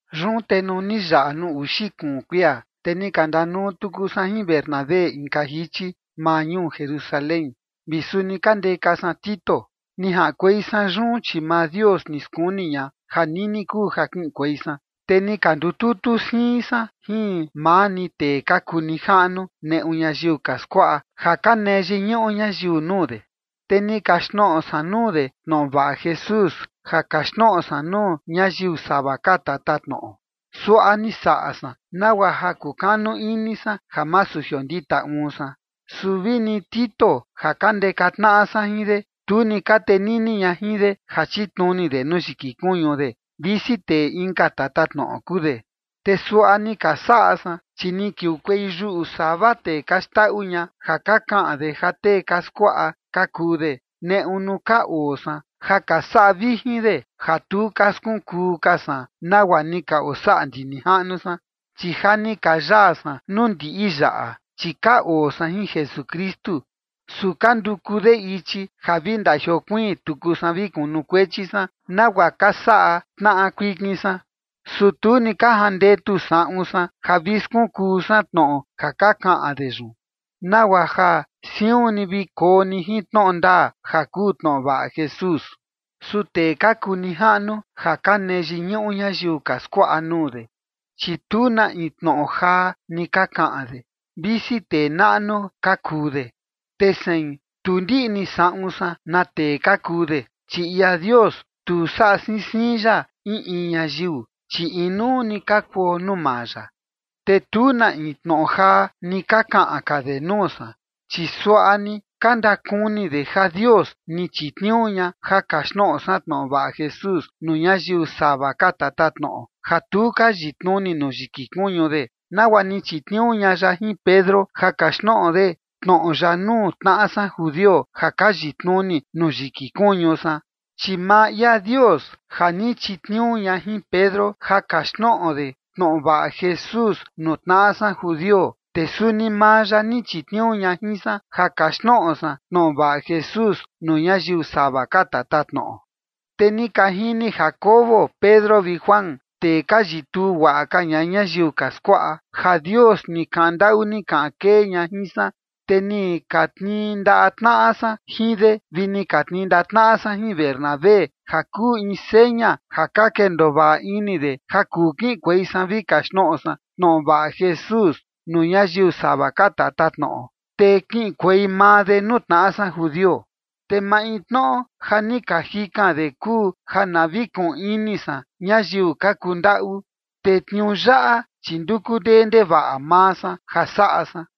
Yun te nuu ni yaꞌa nuu uxi kuun kuia, te ni ka ndanuu tuku san jin Bernabé inka jichi maa ñuu Jerusalén, vi suni ka ndeka san Tito. Ni jaꞌankuei san yun, chi maa Dios ni skuni ña ja nini kuu ja kiꞌinkuei san. Te ni ka ndututu siin san jin maa ni tee ka kuu nijaꞌnu neꞌu ñayiu ka skuaꞌa ja ka nee yiñuꞌu ñayiu nuu de. Te ni kaxtnoꞌo san nuu de tnoꞌo vaꞌa Jesús ja kaxtnoꞌo san nuu ñayiu sava ka tatatnoꞌo. Suaꞌa ni saꞌa san nagua ja kukanu ini san ja masu jiondita uun san. Su vi ni Tito ja ka ndeka tnaꞌa san jin de, tu ni ka tenini ña jin de ja chitnuni de nuu yiki kuñu de, visi tee inka tatatnoꞌo kuu de. Te suaꞌa ni ka saꞌa san, chi ni kiukuei yuꞌu sava tee ka xndaꞌu ña ja ka kaꞌan de ja tee ka skuaꞌa ka kuu de, neꞌu nuu ka oo san, ja ka saꞌa vijin de ja tu ka skunkuu ka san nagua ni ka osaꞌa ndi nijaꞌnu san. Chi ja ni ka yaa san nuu ndiꞌi yaꞌa, chi ka oo san jin Jesukristu, su ka nduku de ichi ja vi ndajiokuiin tuku san vi kunukuechi san nagua ka saꞌa tnaꞌa kuikin san. Su tu ni ka jandetu saꞌun san ja vi skunkuu san tnoꞌo ja ka kaꞌan de yun, nagua ja siun ni vi koo ni jin tnoꞌo ndaa ja kuu tnoꞌo vaꞌa Jesús. Su tee ka kuu nijaꞌnu ja ka nee yiñuꞌu ñayiu ka skuaꞌa nuu de, chi tu na in tnoꞌo jaa ni ka kaꞌan de, visi tee naꞌnu ka kuu de. Te sein, tu ndiꞌni saꞌun san na tee ka kuu de, chi ia Dios, tu saꞌa siin siin ya in in ñayiu, chi inuu ni ka kuo nuu maa ya. Te tu na in tnoꞌo jaa ni ka kaꞌan ka de nuu san, chi suaꞌa ni ka ndakuni de ja Dios ni chitniuu ña ja kaxtnoꞌo san tnoꞌo vaꞌa Jesús nuu ñayiu sava ka tatatnoꞌo ja tu ka yitnuni nuu yiki kuñu de, nagua ni chitniuu ña ya jin Pedro ja kaxtnoꞌo de tnoꞌo ya nuu tnaꞌa san judio, ja ka yitnuni nuu yiki kuñu san. Chi maa ia Dios ja ni chitniuu ña jin Pedro ja kaxtnoꞌo de tnoꞌo vaꞌa Jesús nuu tnaꞌa san judio, te suni maa ya ni chitniuu ña jin san ja kaxtnoꞌo san tnoꞌo vaꞌa Jesús nuu ñayiu sava ka tatatnoꞌo. Te ni ka jini Jacobo, Pedro vi Juan, tee ka yituu guaꞌa ka ña ñayiu ka skuaꞌa, ja Dios ni kaꞌan ndaꞌu ni kaꞌan kee ña jin san, te ni ka tnii ndaꞌa tnaꞌa san jin de vi ni ka tnii ndaꞌa tnaꞌa de jin Bernabé ja kuu in seña ja ka kendoo vaꞌa ini de ja kuu kiꞌinkuei san vi kaxtnoꞌo san tnoꞌo vaꞌa Jesús nuu ñayiu sava ka tatatnoꞌo, te kiꞌinkuei maa de nuu tnaꞌa san judio. Te maintnoꞌo ja ni ka jikan de kuu ja na vi kuꞌun ini san ñayiu ka kundaꞌu, te tniuu yaꞌa chi nduku ndee ndevaꞌa maa san ja saꞌa san.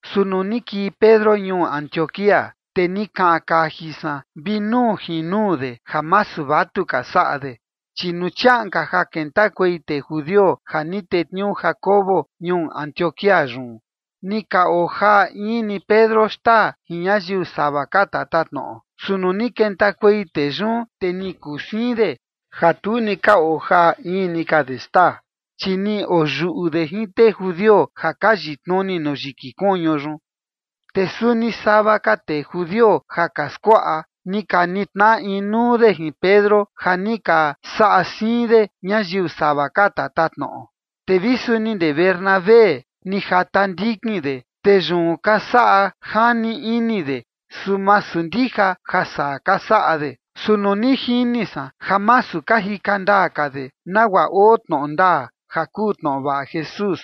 Su nuu ni kii Pedro ñuu Antioquía, te ni kaꞌan kaji san vi nuu jin nuu de ja masu vatuka saꞌa de. Chi nuu chiaꞌan ka ja kentakuei tee judio ja ni tetniuu Jacobo ñuu Antioquía yun, ni ka ojaa in ni Pedro xtaa jin ñayiu sava ka tatatnoꞌo. Su nuu ni kentakuei tee yun, te ni kuu siin de, ja tu ni ka ojaa in ni ka de xtaa, chi ni oyuꞌu de jin tee judio ja ka yitnuni nuu yiki kuñu yun. Te suni sava ka tee judio ja ka skuaꞌa, ni ka nitnaꞌa inuu de jin Pedro, ja ni ka saꞌa siin de ñayiu sava ka tatatnoꞌo. Te vi suni ndee Bernabé, ni jata ndikin de, te yun ka saꞌa jani ini de, su masu ndija ja saa ka saꞌa de. Su nuu ni jini san ja masu ka jika ndaa ka de, nagua oo tnoꞌo ndaa ja kuu tnoꞌo vaꞌa Jesús,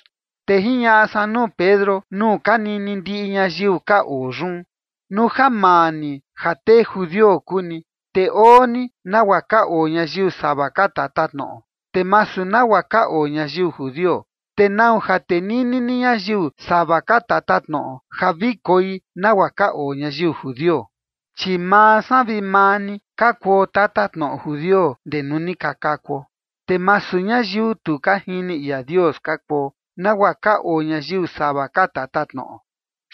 te jiñaꞌa san nuu Pedro nuu ka nini ndiꞌi ñayiu ka oo yun: “Nuu ja maa ni ja tee judio kuu ni, te oo ni nagua ka oo ñayiu sava ka tatatnoꞌo, te masu nagua ka oo ñayiu judio, ¿te nau ja tenini ni ñayiu sava ka tatatnoꞌo ja vi koi nagua ka oo ñayiu judio? ’Chi maa san vi maa ni, ka kuo tatatnoꞌo judio ndee nuu ni ka kakuo, te masu ñayiu tu ka jini ia Dios ka kuo, nagua ka oo ñayiu sava ka tatatnoꞌo.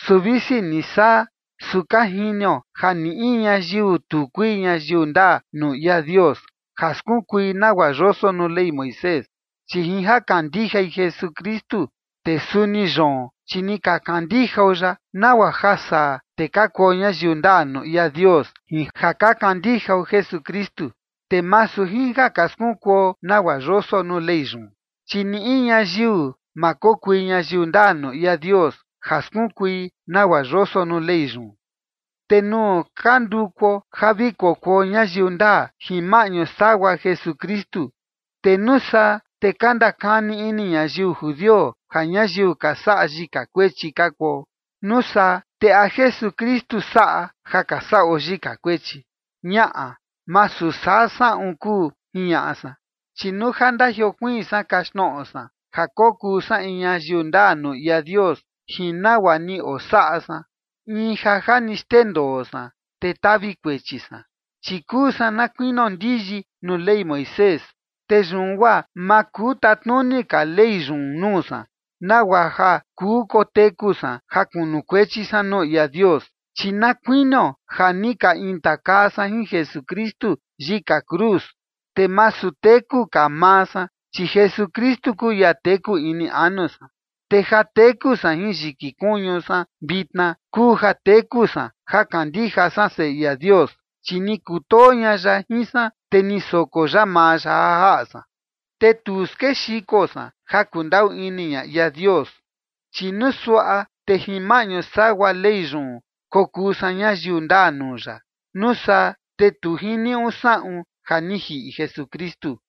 Su visi ni saa, su ka jinio ja ni in ñayiu tu kui ñayiu ndaa nuu ia Dios ja skunkui nagua yoso nuu Ley Moisés, chi jin ja kandijai Jesukristu. Te suni yoon, chi ni ka kandijao ya, nagua ja saa te ka kuo ñayiu ndaa nuu ia Dios jin ja ka kandijao Jesukristu, te masu jin ja ka skunkuo nagua yoso nuu Ley yun, chi ni in ñayiu ma kokui ñayiu ndaa nuu ia Dios ja skunkui nagua yoso nuu Ley yun. ’Te nuu ka ndukuo ja vi kokuo ñayiu ndaa jin maꞌñu sagua Jesukristu, te nuu saa te ka ndakani ini ñayiu judio ja ñayiu ka saꞌa yika kuechi ka kuo. Nuu saa, ¿te a Jesukristu saꞌa ja ka saꞌo yika kuechi? Ñaꞌa, masu saa saꞌun kuu”, jiñaꞌa san. Chi nuu ja ndajiokuiin san kaxtnoꞌo san ja kokuu san in ñayiu ndaa nuu ia Dios jin nagua ni osaꞌa san, in ja ja ni xndendoo san, te tavi kuechi san. Chi kuu san na kuinio ndiyi nuu Ley Moisés, te yun guaa ma kuu tatnuni ka Ley yun nuu san, nagua ja kuu koteku san ja kunukuechi san nuu ia Dios. Chi na kuinio ja ni ka intakaa san jin Jesukristu yika cruz, te masu teku ka maa san, chi Jesukristu kuu ia teku ini anu san. Te ja teku san jin yiki kuñu san vitna kuu ja teku san ja kandija san Seꞌe ia Dios, chi ni kutoo ña ya jin san, te ni soko ya maa ya ja jaꞌa san. Te tu skexiko san ja kundaꞌu ini ña ia Dios, chi nuu suaꞌa te jin maꞌñu sagua Ley yun kokuu san ñayiu ndaa nuu ya, nuu saa te tu jiniuꞌu saꞌun ja ni jiꞌi Jesukristu.